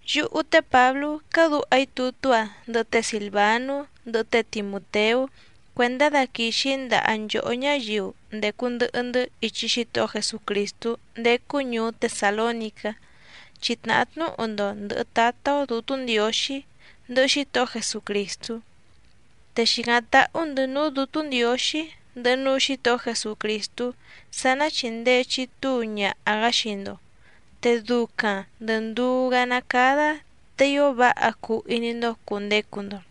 Yúhú té Pǎblú cádǔha‑í tutú‑a ndɨhɨ té Sìlvanú, ndɨhɨ té Timùteú cuèndá daquìxi‑í ndaha nchòhó ñáyiu ndècu ndɨhɨ‑ndɨ́ ichi Xítohó Jesucrìstú ndécú ñùú Tesàlónicá, chi tnàhá tnúhu‑ndo ndɨ̀hɨ Tátá‑ó Dǔtú Ndiǒxí, ndɨhɨ Xítohó Jesucrìstú. Te xìcáⁿ táhú‑ndɨ̌ núú Dǔtú Ndiǒxí, ndɨhɨ núú Xǐtohó Jesucrìstú sá ná chìndee chitúu ñaha‑gá xii‑ndo, te ducaⁿ ndɨ̀ nduú‑gá ná cádá te ío váha cuu iní‑ndó cùndecu‑ndo.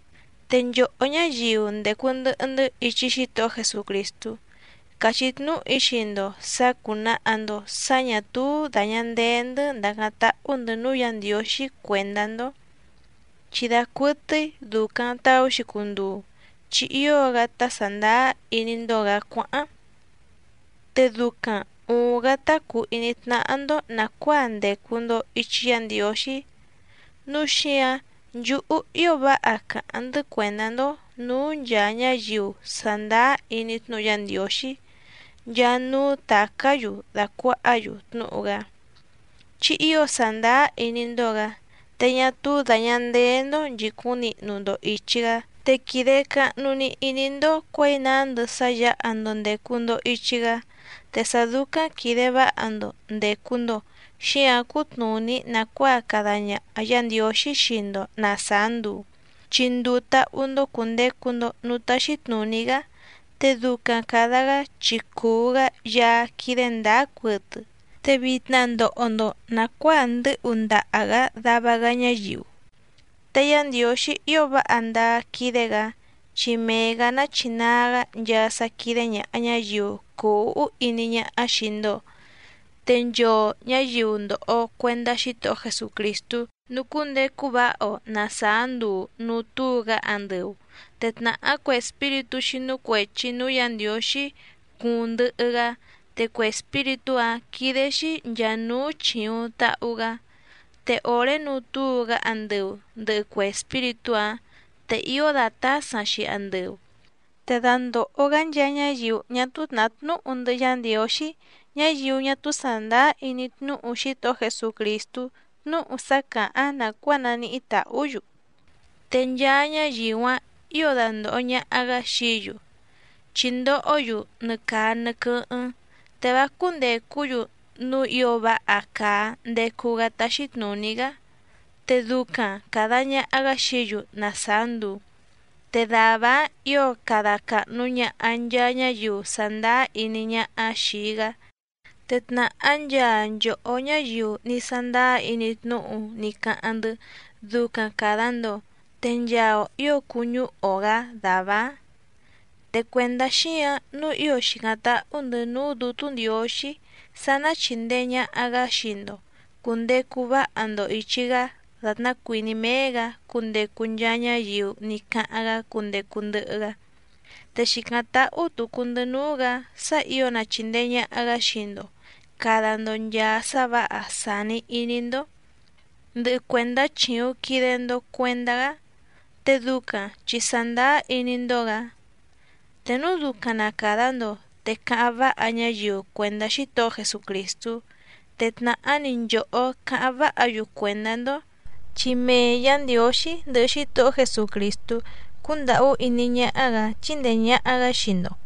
Te nchòhó ñáyiu ndècu ndɨhɨ‑ndɨ́ ichi Xítohó Jesucrìstú, càchí tnúhu‑í xii‑ndo sǎ cúnàha‑ndo sá ñà túú dàña ndee‑ndɨ́ ndàcáⁿ táhú‑ndɨ̌ núú Yǎ Ndiǒxí cuèndá‑ndó, chi dacuɨtɨ́í dùcaⁿ taú‑xi cunduu chi ío‑gá tá sàndáá iní‑ndó‑gǎ cuáháⁿ, te ducaⁿ ùuⁿ‑gá tá cùu iní tnáhá‑ndó nàcuáa ndècu‑ndo ichi Yá Ndiǒxí. Núu xíǎⁿ nchúhú ío váha càháⁿ‑ndɨ́ cuèndá‑ndó nǔú nchàa ñáyiu sàndáá iní tnúhu Yá Ndiǒxí nchaa núú tàcá‑yu dàcuahá‑yu tnúhu‑gá, chi ío sàndáá iní‑ndó‑gǎ, te ñá túú dàña ndeé‑ndó nchìcúⁿ nihnu‑ndo ìchi‑gá, te quìde cahnu‑ni iní‑ndó cuěi nándɨ sá yǎha‑ndo ndècu‑ndo ichi‑gá. Te sá dúcáⁿ quìde váha‑ndo ndècu‑ndo xíǎⁿ cútnùní nàcuáa cada ñaha Yǎ Ndiǒxí xii‑ndo na sàá nduu, chi nduu táhú‑ndó cùndecu‑ndo núú táxí tnùní‑gá, te ducaⁿ càda‑gá chi cùu‑gá Yaá quídé ndǎá cuɨtɨ. Te vitna ndòho‑ndo nacuáa ndɨ́hu ndaha‑gǎ dava‑gá ñáyiu. Te Yá Ndiǒxí ío váha ndáá quídé‑gǎ, chi mee‑gǎ nachinaa‑gá nchaa sá quídé ñàha ñáyiu cùu úhú iní ñáhá xìi‑ndo, te nchoo ñǎyiu ndòho cuendá Xítohó Jesucrìstú nucúndecu váha‑o na sàá nduu nùu túu‑gá andɨu, te tnàhá cue espíritú xínú cuèchi núú Yǎ Ndiǒxí cuuⁿ ndɨhɨ‑gá, te cue espíritú‑áⁿ quídé‑xí nchàa núú chìuⁿ tahu‑gá. Te òré nuu túu‑gá andɨu ndɨ̀hɨ cue espíritú‑áⁿ, te ío dàtásaⁿ‑xi andɨu. Te dandòho‑gá nchaa ñáyiu ñá túú tnàhá tnúhu ndɨhɨ Yá Ndiǒxí, ñáyiu ñá túú sàndáá iní tnúhu Xítohó Jesucrìstú tnúhu sá càháⁿ nàcuáa naníhí tàhú‑yu. Te nchaa ñáyiu‑áⁿ ǐo dandòho ñaha‑gá xií‑yu, chi ndohó‑yu nɨ caa nɨ quɨ́hɨ́ⁿ, te vá cúndècú‑yu núú ǐo váha càa ndecu‑gá táxí tnùní‑gá. Te ducaⁿ càda ñaha‑gá xií‑yu na sàá nduu, te dàvá‑áⁿ ǐo cada càhnu ñaha nchaa ñáyiu sàndáá iní ñáhá xìi‑gá. Te tnàhá nchaa nchòhó ñáyiu ní sándáá iní tnúhu ní cáháⁿ‑ndɨ́ ducaⁿ càda‑ndo, te nchaa‑o ǐo cuñúhu‑o‑gǎ dàvá‑áⁿ. Te cuèndá xíǎⁿ nǔu ío xìcáⁿ táhú‑ndɨ̌ núú Dǔtú Ndiǒxí sá ná chìndee ñaha‑gá xii‑ndo cùndecu váha‑ndo ìchi‑gá dàtná cuìní méé‑gǎ cundecu nchaa ñáyiu ní cáháⁿ‑gá cundecu ndɨhɨ‑gá. Te xìcáⁿ táhú tùcu‑ndɨ́ núú‑gǎ sá ǐo na chìndee ñaha‑gá xii‑ndo càda‑ndo nchaa sá vǎha sàni iní‑ndó, ndɨhɨ cuèndá chìuⁿ quide‑ndo cuendá‑gá, te ducaⁿ chi sàndáá iní‑ndó‑gǎ. Te núu ducaⁿ na càda‑ndo, te cáháⁿ váha ñáyiu cuèndá Xítohó Jesucrìstú, te tnàhá‑ni nchòhó cáháⁿ váha‑yu cuèndá‑ndó, chi mee Yǎ Ndiǒxí ndɨhɨ Xítohó Jesucrìstú cúndàhú iní ñáhá‑gǎ chíndèe ñaha‑gá xii‑ndo.